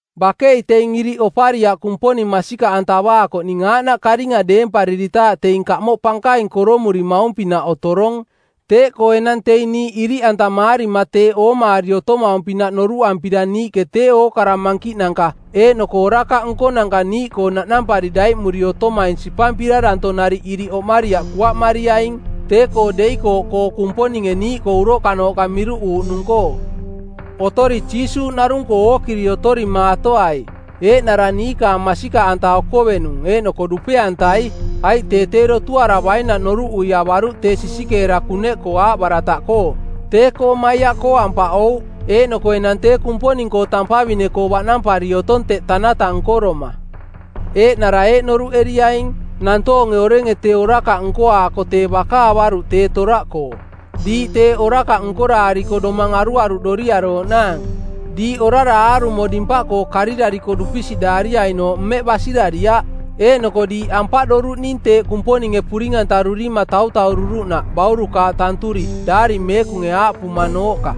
Bakei teing iriꞌ opariaꞌ Kumponing masikaꞌantavaakoꞌning aaꞌnaꞌ karinga deempariritaaꞌ teing kamoꞌ pankaing koromurimaung-pinaꞌ otorong. Teeꞌkoo enang teing niiꞌ iriꞌantamaarima teeꞌ oomaari otomaung-pinaꞌ noruꞌampira niiꞌke tee ookara mankiꞌnanka eeꞌnoko orakaꞌ nkonanka niiꞌkoo naꞌnampari daiꞌmuri otomaing sipampira danto nariꞌ iriꞌ oꞌmariaꞌ kuaꞌmariaing tee-koo deikooꞌkoo Kumponinge niiꞌkoo uroꞌkanooꞌka miruꞌuuꞌnung-koo. Otori Jiisuuꞌ narung-koo ookiri otorimaatoai, eeꞌnara niikaang masikaꞌanta okovenung eeꞌnoko dupe-antai. Aiꞌ tee tee dotuaravainaꞌ noruꞌui avaruꞌ tee sisikeera kuneꞌkoo aaꞌbarataꞌkoo; tee-koo maiaꞌkoo ampaꞌouꞌ; eeꞌnoko enang tee Kumponing-koo tampavine-koo baꞌnampari otong teꞌ tanata nkoroma. Eeꞌnara eeꞌ noruꞌeriaing: nantoonge orenge tee orakaꞌ nkoaako tee baka avaruꞌ tee toraꞌkoo, diiꞌ teeꞌ orakaꞌ nkoraariko domang aruaruꞌdoriarooꞌnaang. Diiꞌ orara aarumo dimpaꞌkoo karirariko dupisiꞌdaariainooꞌ mmeꞌ basirariaꞌ. Eeꞌnoko diiꞌ ampaꞌdoruꞌning teeꞌ Kumponinge puring-antaruri tautaururuꞌnaꞌ baurukaaꞌ tanturi, Daari Meekunge aaꞌpumanooꞌka,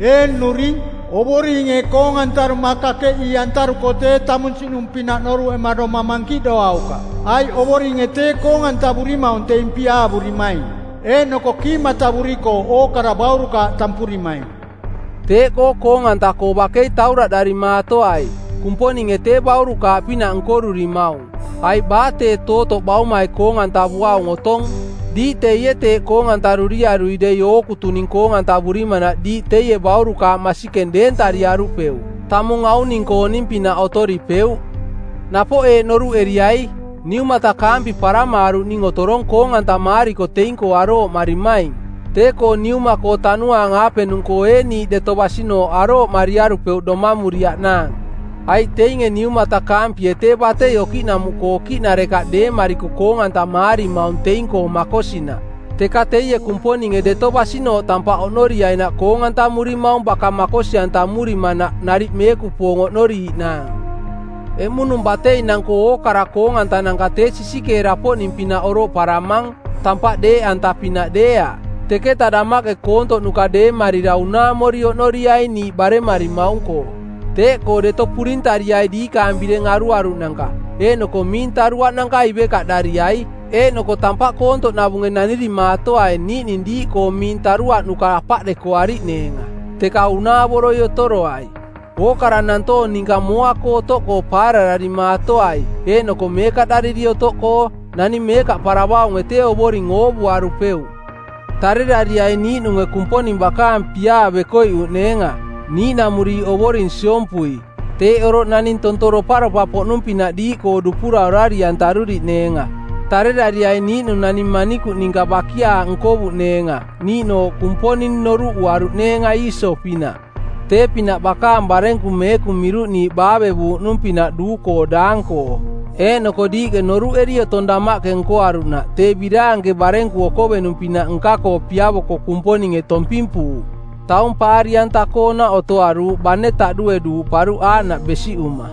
“Ee nnuring, Ovoringe koong-antaruma kakeꞌii-antaruko tee tamunsiꞌnung-pinaꞌ noruꞌema domang mankiꞌdoaukaꞌ. Aiꞌ Ovoringe tee koong-antavurimaung teing piaavurimaing, eeꞌnoko kiimatavurikooꞌ ookara baurukaaꞌ tampurimaing.” Teeꞌkoo koong-anta-koo bakei tauraꞌdarimaatoai. Kumponinge tee baurukaaꞌpinaꞌ nkorurimaung, aiꞌ baa tee tootoꞌ baumai koong-antavuaung otong? Diiꞌ teie teeꞌ koong-antaruriarui dei ookutuning koong-antavurimanaꞌ diiꞌ teie baurukaaꞌ masikeng deentariarupeuꞌ, tamung auning-kooning-pinaꞌ otoripeuꞌ. Napoꞌ eeꞌ noruꞌeriai, niumatakaampi paramaaruꞌning otorong koong-antamaariko teing-koo arooꞌmarimaing, tee-koo Niuma-koo tanuaang-aapenung-koo ee niiꞌ deto basinooꞌ arooꞌmariarupeuꞌ domamuriaꞌnaang? Aiꞌ teinge niumatakaampie tee batei okiꞌnamuꞌkoo okiꞌnarekaꞌ deemariko koong-antamaarimaung teing-koo makosinaꞌ, teka teie Kumponinge deto basinooꞌ tampaꞌ oꞌnoriainaꞌ koong-antamurimaung baka makosi-antamurimanaꞌ nariꞌ meekupoong oꞌnoriiꞌnaang. Eꞌmunung bateinang-koo ookara koong-antananka tee sisikeera-poꞌning-pinaꞌ oroꞌparamang, tampaꞌ deeꞌanta-pinaꞌ deeaꞌ. Teketa damaꞌke koontoꞌnuka deemarira unaamori oꞌnoriaing niiꞌ baremarimaung-koo. Teeꞌkoo Deto purintariai diikaang bireng aruaruꞌnanka eeꞌnoko miing taruaꞌnanka ivekaꞌdariai. Eeꞌnoko tampaꞌ koontoꞌnavunge nanirimaatoai niiꞌning diiꞌkoo miing taruaꞌnuka apaꞌdekoariꞌneenga, teka unaavoroi otoroai. Ookara nantoong ninka mooa-koo otoꞌkoo paarararimaatoai eeꞌnoko meekaꞌdariri otoꞌkoo. Naning meekaꞌparavaunge tee Ovoring oovuarupeuꞌ. Tarerariaing niiꞌnunge Kumponing bakaang piaa bekoiꞌuꞌneenga, niiꞌnamuriiꞌ ovoring siompui. Teeꞌ oroꞌ naning tonto doparopa-poꞌnung-pinaꞌ diiꞌkoo dupura orari-antaruriꞌneenga. Tarerariaing niiꞌnung naning manikuꞌ ninka bakiaaꞌ nkovuꞌneenga niiꞌnooꞌ Kumponing noruꞌuaruuꞌneenga Iiso-pinaꞌ, tee-pinaꞌ bakaang barenku meekung miruꞌniiꞌ baavevuuꞌnuung-pinaꞌ duu-koo daang-koo. Eeꞌnoko diiꞌke noruꞌeri otong damaꞌke nkoaruꞌnaꞌ tee biraanke barenku okovenung-pinaꞌ nka-koo piavoko Kumponinge tompimpuuꞌ. Taung paari-anta-koonaꞌ otoaruuꞌ bane taꞌdue duuꞌparuꞌ aaꞌnaꞌ besiꞌuma.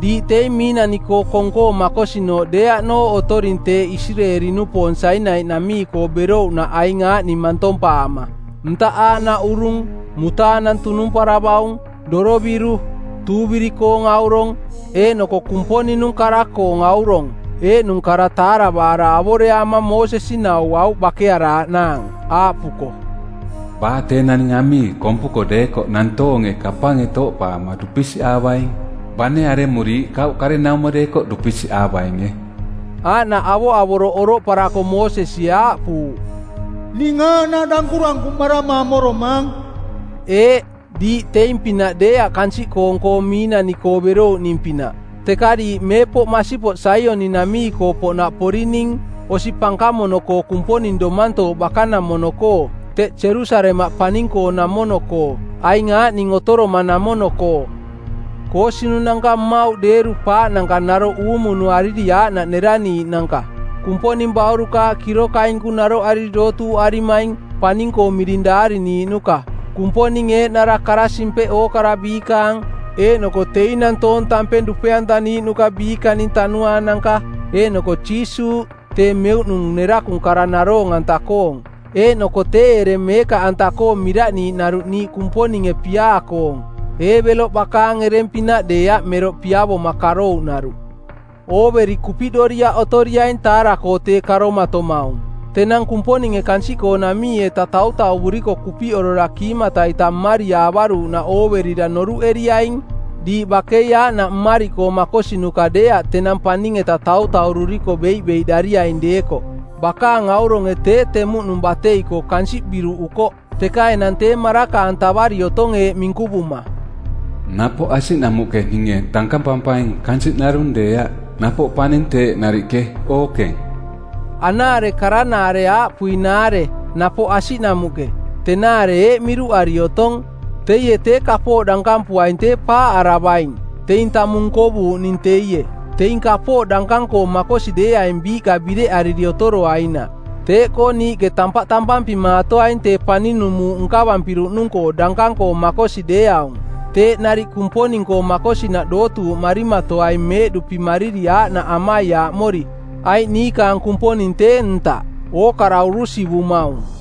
Diiꞌ teing miinani-koo kong-koo makosinooꞌ deeaꞌnooꞌ otoring teeꞌ Isireeli-nupoong Sainai-namii-koo berouꞌnaꞌ aing aaꞌning mantompaama: ntaꞌ aaꞌnaꞌ urung, mutaanang tunumparavaung, doroviru, tuuviri-koong aurong, eeꞌnoko Kumponing-nung kara-koong aurong, eeꞌnung kara taaravaara avoreaama Moosesi nauauꞌ bakearaaꞌnaang, aaꞌpuko, “Baa tee naning amii kompuko deekoꞌ nantoonge kapange tooꞌpaama dupisiꞌaavaing, bane aremuriiꞌ, kauꞌ karenaumo deekoꞌ dupisiꞌaavainge.” Aaꞌnaꞌ avoꞌavoroꞌ oroꞌparako Moosesie aaꞌpuuꞌ, “Ning aaꞌnaꞌ dankurankuꞌmarama amoromaang.” Eeꞌ, diiꞌ teing-pinaꞌ deeaꞌ kansiꞌkoong-koo miinani-koo berouꞌning-pinaꞌ; Teka diiꞌ meepoꞌ masipoꞌ Saioni-namii-koo poꞌnaꞌ porining, osi pankamono-koo Kumponing Domantooꞌ bakanamono-koo, teꞌ Jerusalemaꞌ paning-koonamono-koo, aing aaꞌning otoromanamono-koo: koosinunanka mmauꞌ deeru-paaꞌnanka naroꞌ uumunuariri˜ aaꞌnaꞌ neraniiꞌnanka; Kumponing baurukaaꞌ kirokainku naroꞌariri dootuuꞌarimaing, paning-koo miring daariniiꞌnuka; Kumponing Eeꞌnara Kara-simpeꞌ ookara biikaang; eeꞌnoko teing nantoong tampeng dupe-antaniiꞌnuka biikaning tanuaananka; eeꞌnoko Jiisuuꞌ, tee Meuꞌnung nerakung kara naroong-anta-koong; eeꞌnoko tee ereng meekaꞌanta-koo miraꞌniiꞌnaruꞌ niiꞌ Kumponinge piaa-koong, Eebeloꞌ bakaang ereng-pinaꞌ deeaꞌ meroꞌ piavoma karouꞌnaruꞌ. Ooveri kupiꞌdoriaꞌ otoriaing taara-koo tee karomatomaung. Tenang Kumponinge kansiꞌkoonamii-etaꞌ tautauvuriko kupiꞌorora kiimata-ita mmariaavaruꞌnaꞌ ooverira noruꞌeriaing diiꞌ bakei aaꞌnaꞌ mmariꞌkoo makosinuka deeaꞌ tenang paning-eta tautaururiko beiꞌbeiꞌdariaing deekoꞌ. Bakaang auronge tee temuꞌnung batei-koo kansiꞌ biruꞌukoꞌ, teka enang tee maraka-antavari otong eeꞌ minkuvuma, “Napoꞌ asiꞌnamuꞌke ninge dankampampaing kansiꞌ narung deeaꞌ, napoꞌ paning teeꞌ nariꞌke, ookeng.” Anaare karanaare aaꞌpuinaare “Napoꞌ asiꞌnamuꞌke” tenaare eeꞌ miruꞌari otong: Teie tee kapooꞌ dankampuaing tee paaꞌaravaing, teing tamung nkovuuꞌning teie, teing kapooꞌ dankang-koo makosi deeaing biiꞌka bireꞌariri otoroainaꞌ. Teeꞌkoo niiꞌke tampaꞌ tampampimaatoaing tee paninung muuꞌ nkavampiruꞌnung-koo dankang-koo makosi deeaung; Teeꞌ nariꞌ Kumponing-koo makosinaꞌ dootuuꞌmarimatoaing meeꞌduꞌpimariri aaꞌnaꞌ amaiaaꞌmori, aiꞌ niikaang Kumponing tee ntaꞌ, ookara urusivumaung.